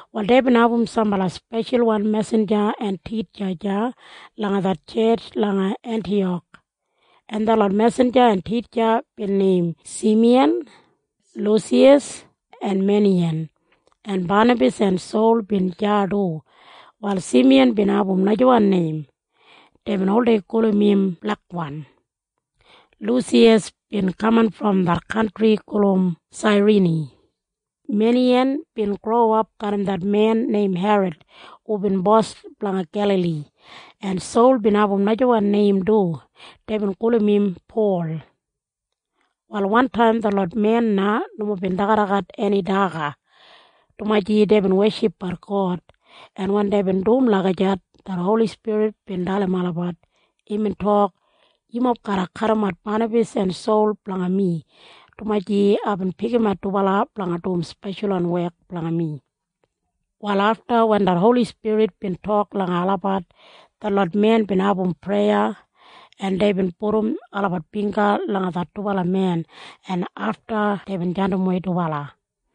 Wal deibin abum sambala speshalwan mesinja en titja deya langa det tjetj langa Entiyak, en detlot mesinja en titja bin neim Simiyan, Lusiyas en Meneyin. En Banabas en Sol bin deya du. Wal Simiyan bin abum najawan neim. Deibin oldei gulum im Blekwan. Lusiyas bin kaman brom det kantri gulum Sairini. Meneyin bin growap garram det men neim Herod hubin bos blanga Gelali. En Sol bin abum najawan neim du. Deibin gulum im Pol. Wal wantaim detlot men na nomo bin dagadagat eni daga, dumaji deibin weshipbat God, en wen deibin dum lagijat, det Holi Spirit bin dalim olabat. Imbin tok, “Yumob garra kadimat Banabas en Sol blanga mi, dumaji aibin pikimat dubala blanga dum speshalwan wek blanga mi.” Wal afta wen det Holi Spirit bin tok langa olabat, detlot men bin abum preya, en deibin pudum olabat bingga langa det dubala men, en afta deibin jandimwei dubala.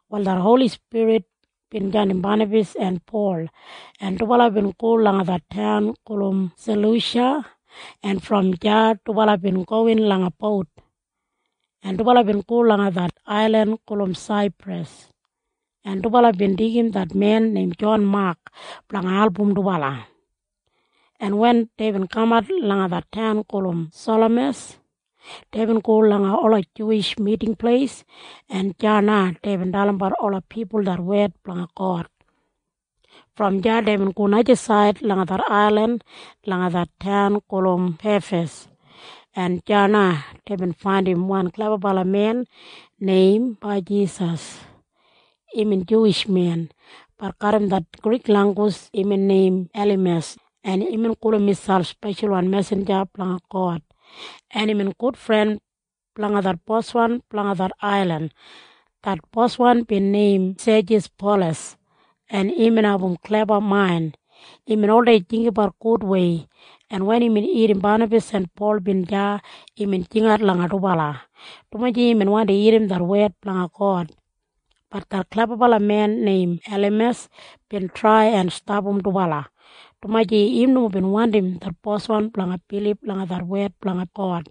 Wal det Holi Spirit bin jandim Banabas en Pol, en dubala bin go langa det taun gulum Salusha, en brom deya dubala bin gowin langa bout, en dubala bin go langa det ailin gulum Saipras. En dubala bin deigim det men neim Jon Mak blanga album dubala, en wen deibin kamat langa det taun gulum Salamas, deibin go langa ola Juwish Miting Pleis, en deya na deibin dalimbat ola pipul det wed blanga God. Brom deya deibin go najasaid langa det ailin langa det taun gulum Pefas, en deya na deibin faindim wan klebabalamen neim Bajisas. Imbin Juwish men. Bat garram det Grik langgus imbin neim Elimas, en imbin gulum miselp speshalwan mesinja brom God, en imbin gudfren blanga det boswan blanga det ailin. Det boswan bin neim Sejis Polas, en imbin abum kleba main. Imbin oldei jinggabat gudwei, en wen imbin irrim Banabas en Pol bin deya, imbin jingat langa dubala, dumaji imbin wandi irrim det wed blanga God. Bat det klebabalamen neim Elimas bin trai en stapam dubala, dumaji im nomo bin wandim det boswan blanga bilib langa det wed blanga God,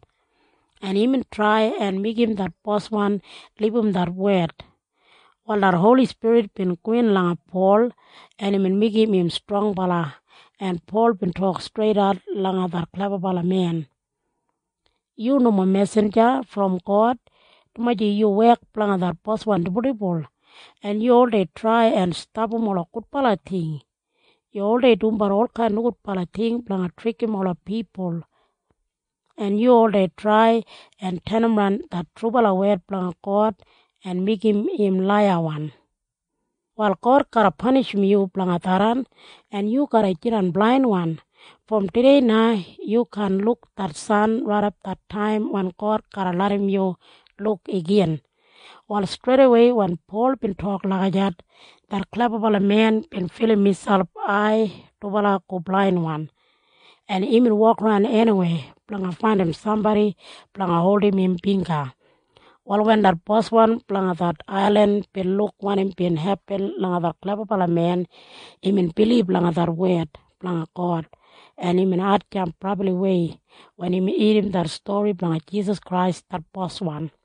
en imbin trai en meigim det boswan libum det wed. Wal det Holi Spirit bin gowin langa Pol, en imbin meigim im strongbala, en Pol bin tok streidat langa det klebabalamen. “Yu nomo mesinja brom God, dumaji yu wek blanga det boswan dibuldibul, en yu oldei trai en stapam ola gudbala ting. Yu oldei dumbat olkain nogudbala ting blanga trikim ola pipul, en yu oldei trai en tenimran det trubala wed blanga God en meigim im laiyawan. Wal God garra panishim yu blanga tharran, en yu garra jidan blainwan. Brom tudei na yu kaan luk det san raidap det taim wen God garra larram yu luk igin.” Wal streidawei wen Pol bin tok lagijat, det klebabalamen bin filim im ai dubala go blainwan, en imbin wokaran eniwei blanga faindim sambodi blanga holdim im bingga. Wal wen det boswan blanga det ailin bin luk wanim bin hepin langa det klebabalamen, imbin bilib langa det wed blanga God, en imbin hatjamp brabliwei wen imbin irrim det stori blanga Jisas Krais det Boswan.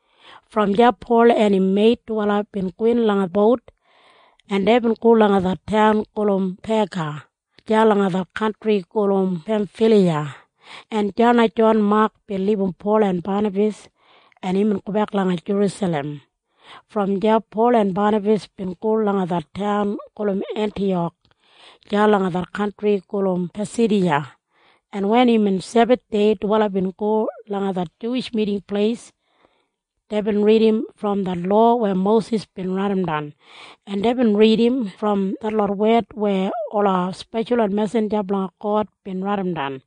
Brom deya Pol en im meit dubala bin gowin langa bout, en deibin go langa det taun gulum Pega deya langa det kantri gulum Pemfiliya, en deya na Jon Mak bin libum Pol en Banabas, en imbin gobek langa Jerusalem. Brom deya Pol en Banabas bin go langa det taun gulum Entiyak deya langa det kantri gulum Pasidiya, en wen imbin Sebathdei dubala bin go langa det Juwish Miting Pleis. Deibin ridim brom det lowa weya Mosis bin raidimdan, en deibin ridim brom detlot wed weya ola speshalwan mesinja blanga God bin raidimdan.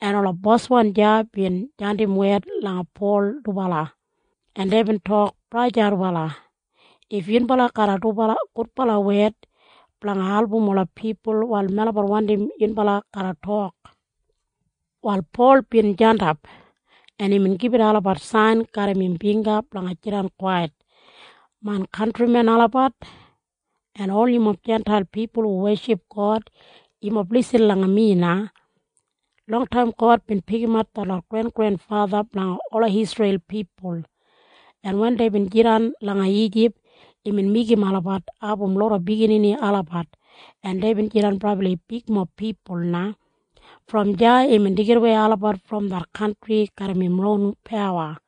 En ola boswan deya bin jandim wed langa Pol dubala, en deibin tok, “Braja dubala, if yunbala garram gudbala wed blanga album ola pipul, wal melabat wandim irrim wanim yunbala garra tok.” Wal Pol bin jandap, en imbin gibit olabat sain garram im bingga blanga jidan kwait, “Main kantrimen olabat, en ol yumob Jintail pipul hu weship God, yumob lisin langa mi na. Longtaim God bin pikimat detlot grengrenfatha blanga ola Isreil pipul, en wen deibin jidan langa Ijip, imbin meigim olabat abum loda biginini olabat, en deibin jidan brabli bigmob pipul na. Brom deya imbin deigidawei olabat brom det kantri garram im ron pawa,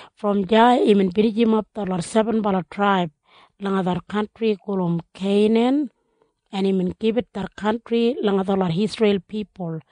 Brom deya imbin binijimap detlot sebenbala traib langa det kantri gulum Keinan, en imbin gibit det kantri langa detlot Isreil pipul.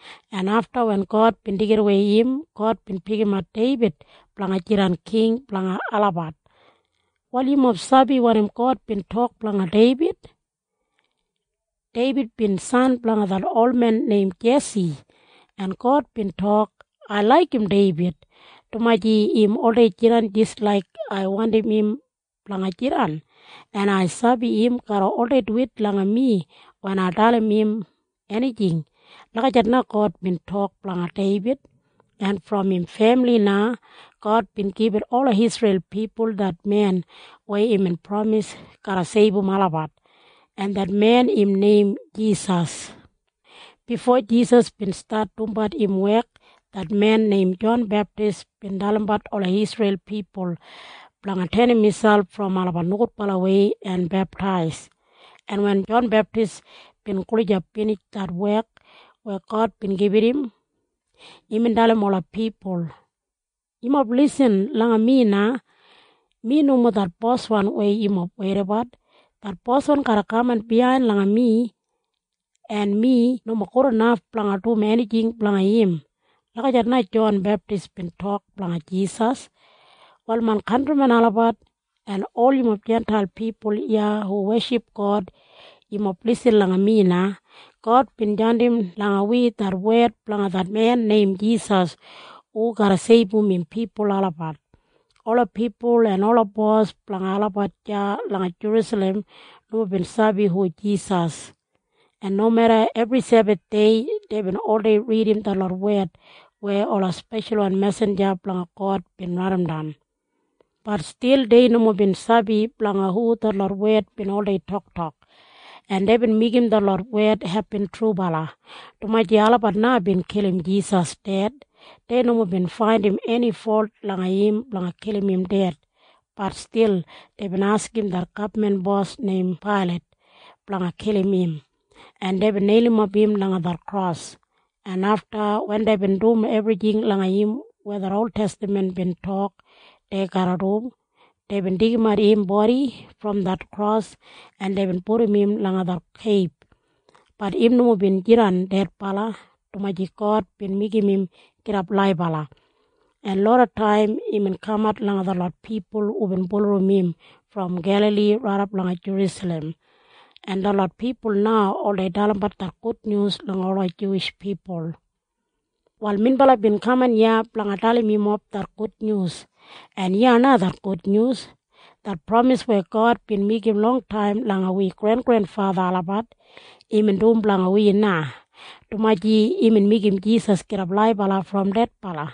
en afta wen God bin deigidawei im, God bin pikimat Deibid blanga jidan king blanga olabat. “Wal yumob sabi wanim God bin tok blanga Deibid? Deibid bin san blanga det olmen neim Jesi, en God bin tok, ‘Ai laigim Deibid, dumaji im oldei jidan jis laik ai wandim im blanga jidan, en ai sabi im garra oldei duwit langa mi wen ai dalim im enijing.’ Lagijat na God bin tok blanga Deibid. En brom im femili na God bin gibit ola Isreil pipul det men weya imbin pramis garra seibum olabat, en det men im neim Jisas. Bifo Jisas bin stat dumbat im wek, det men neim Jon Beptis bin dalimbat ola Isreil pipul blanga tenim miselp brom olabat nogudbalawei en beptais, en wen Jon Beptis bin gulijap binij det wek weya God bin gibit im, imbin dalim ola pipul. ‘Yumob lisin langa mi na. Mi nomo det Boswan weya yumob weidabat. Det Boswan garra kaman biyain langa mi, en mi nomo gudinaf blanga dum enijing blanga im.’ Lagijat na Jon Beptis bin tok blanga Jisas. “Wal main kantrimen olabat, en ol yumob Jintail pipul iya hu weship God, yumob lisin langa mi na. God bin jandim langa wi det wed blanga det men neim Jisas hu garra seibum im pipul olabat. Ola pipul en ola bos blanga olabat deya langa Jerusalem nomo bin sabi hu Jisas, en nomeda ebri Sebathdei deibin oldei ridim detlot wed weya ola speshalwan mesinja blanga God bin raidimdan, bat stil dei nomo bin sabi blanga hu detlot wed bin oldei toktok, en deibin meigim detlot wed hepin trubala, dumaji olabat na bin kilim Jisas ded. Dei nomo bin faindim eni folt langa im blanga kilim im ded, bat stil deibin askim det gabman bos neim Pailat blanga kilim im, en deibin neilimap im langa det kros, en afta wen deibin dum ebrijing langa im weya det oltestaman bin tok dei garra dum, deibin deigimat im bodi brom det kros, en deibin pudum im langa det keib. Bat im nomo bin jidan dedbala, dumaji God bin meigim im gidap laibala, en lodataim imbin kamat langa detlot pipul hubin bulurrum im brom Gelali raidap langa Jerusalem, en detlot pipul na oldei dalimbat det gudnyus langa ola Juwish pipul. “Wal minbala bin kaman iya blanga dalim yumob det gudnyus, en iya na det gudnyus. Det pramis weya God bin meigim longtaim langa wi grengrenfatha olabat, imbin dum blanga wi na, dumaji imbin meigim Jisas gidap laibala brom dedbala.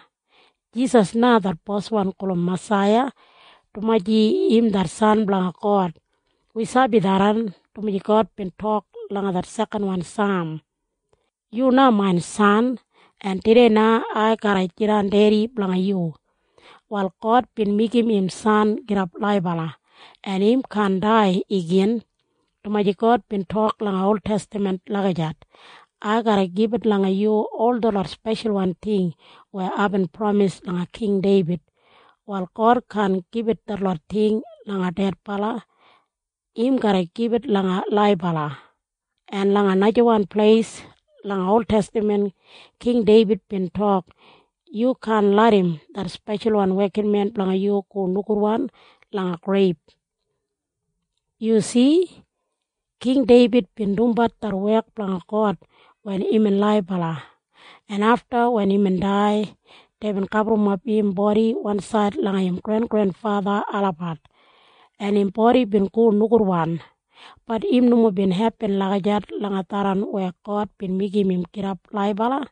Jisas na det Boswan gulum Masaiya, dumaji im det San blanga God. Wi sabi tharran, dumaji God bin tok langa det sekanwan Saam. ‘Yu na main san, en tudei na ai garra jidan Dedi blanga yu.’ “Wal God bin meigim im san gidap laibala, en im kaan dai igin, dumaji God bin tok langa oltestaman lagijat. ‘Ai garra gibit langa yu ol detlot speshalwan ting weya aibin pramis langa King Deibid.’ Wal God kaan gibit detlot ting langa dedbala. Im garra gibit langa laibala. En langa najawan pleis langa oltestaman King Deibid bin tok, ‘Yu kaan larram det speshalwan wekinmen blanga yu go nogudwan langa greib.’ “Yu si? King Deibid bin dumbat det wek blanga God wen imbin laibala, en afta wen imbin dai, deibin gaburrumap im bodi wansaid langa im grengrenfatha olabat, en im bodi bin go nogudwan. Bat im nomo bin hepin lagijat langa tharran weya God bin meigim im gidap laibala.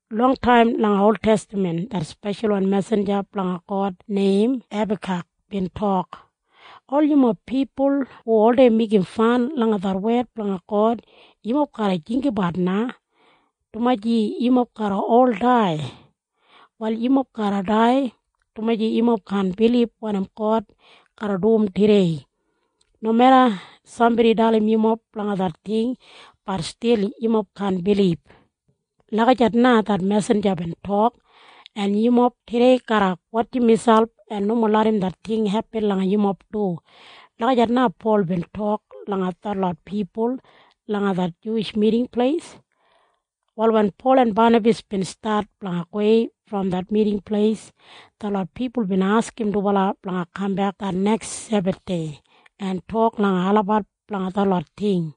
Longtaim langa oltestaman det speshalwan mesinja blanga God neim Hebakak bin tok, ‘Ol yumob pipul hu oldei meigim fan langa det wed blanga God, yumob garra jinggabat na, dumaji yumob garra ol dai. Wal yumob garra dai, dumaji yumob kaan bilib wanim God garra dum tudei. Nomeda sambodi dalim yumob blanga det ting, bat stil yumob kaan bilib.’ Lagijat na det mesinja bin tok. En yumob tudei garra wotjim miselp en nomo larram det ting hepin langa yumob du.” Lagijat na Pol bin tok langa detlot pipul langa det Juwish Miting Pleis. Wal wen Pol en Banabas bin stat blanga gowei brom det Miting Pleis, detlot pipul bin askim dubala blanga kambek det neks Sebathdei en tok langa olabat blanga detlot ting.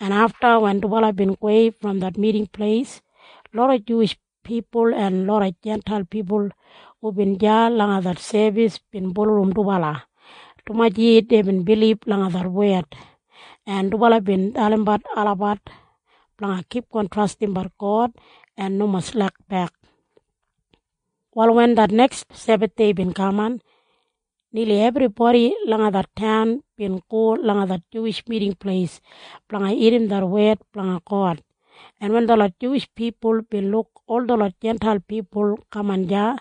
En afta wen dubala bin gowei brom det Miting Pleis, loda Juwish pipul en loda Jintail pipul hubin deya langa det sebis bin bulurrum dubala, dumaji deibin bilib langa det wed, en dubala bin dalimbat olabat blanga kipgon trastimbat God en nomo slekbek. Wal wen det neks Sebathdei bin kaman, nili ebribodi langa det taun bin go langa det Juwish Miting Pleis blanga irrim det wed blanga God, en wen detlot Juwish pipul bin luk ol detlot Jintail pipul kaman deya,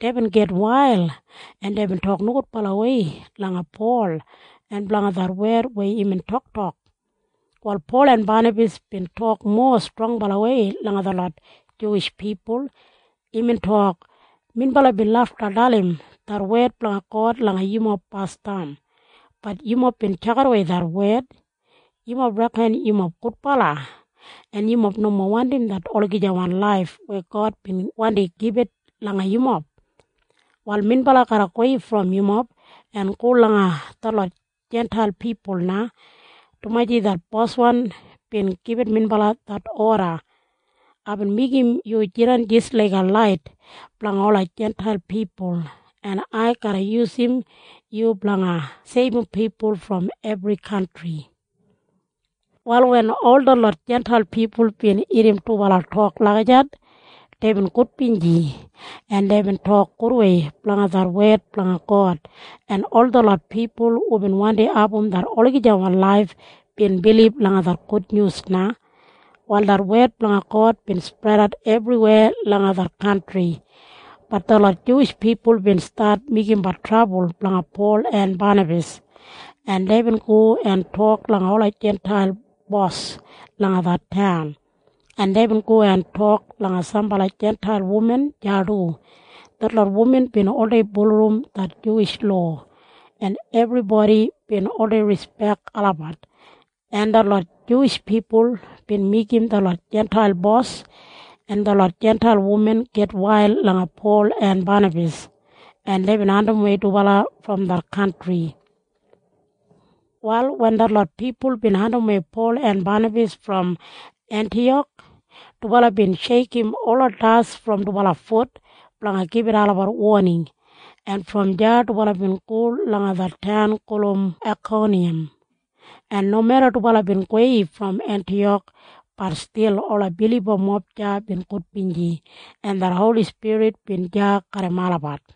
deibin gitwail, en deibin tok nogudbalawei langa Pol en blanga det wed weya imbin toktok. Wal Pol en Banabas bin tok mowa strongbalawei langa detlot Juwish pipul. Imbin tok, “Minbala bin lafta dalim det wed blanga God langa yumob basdam. Bat yumob bin tjakidawei det wed. Yumob reken yumob gudbala, en yumob nomo wandim det olagijawan laif weya God bin wandi gibit langa yumob. Wal minbala garra gowei brom yumob en go langa detlot Jintail pipul na, dumaji det Boswan bin gibit minbala det oda. ‘Aibin meigim yu jidan jis laiga lait blanga ola Jintail pipul, en ai garra yusum yu blanga seibum pipul brom ebri kantri.’” Wal wen ol detlot Jintail pipul bin irrim dubala tok lagijat, deibin gudbinji, en deibin tok gudwei blanga det wed blanga God, en ol detlot pipul hubin wandi abum det olagijawan laif bin bilib langa det gudnyus na. Wal det wed blanga God bin spredat ebriweya langa det kantri. Bat detlot Juwish pipul bin stat meigimbat trabul blanga Pol en Banabas, en deibin go en tok langa ola Jintail bos langa det taun, en deibin go en tok langa sambala Jintail wuman deya du. Detlot wuman bin oldei bulurrum det Juwish lowa, en ebribodi bin oldei rispek olabat, en detlot Juwish pipul bin meigim detlot Jintail bos en detlot Jintail wuman gitwail langa Pol en Banabas, en deibin andimwei dubala brom det kantri. Wal wen detlot pipul bin andimwei Pol en Banabas brom Entiyak, dubala bin sheikim ola das brom dubala fut blanga gibit olabat woning, en brom deya dubala bin go langa det taun gulum Aikoniyam. En nomeda dubala bin gowei brom Entiyak, bat stil ola bilibamob deya bin gudbinji, en det Holi Spirit bin deya garram olabat.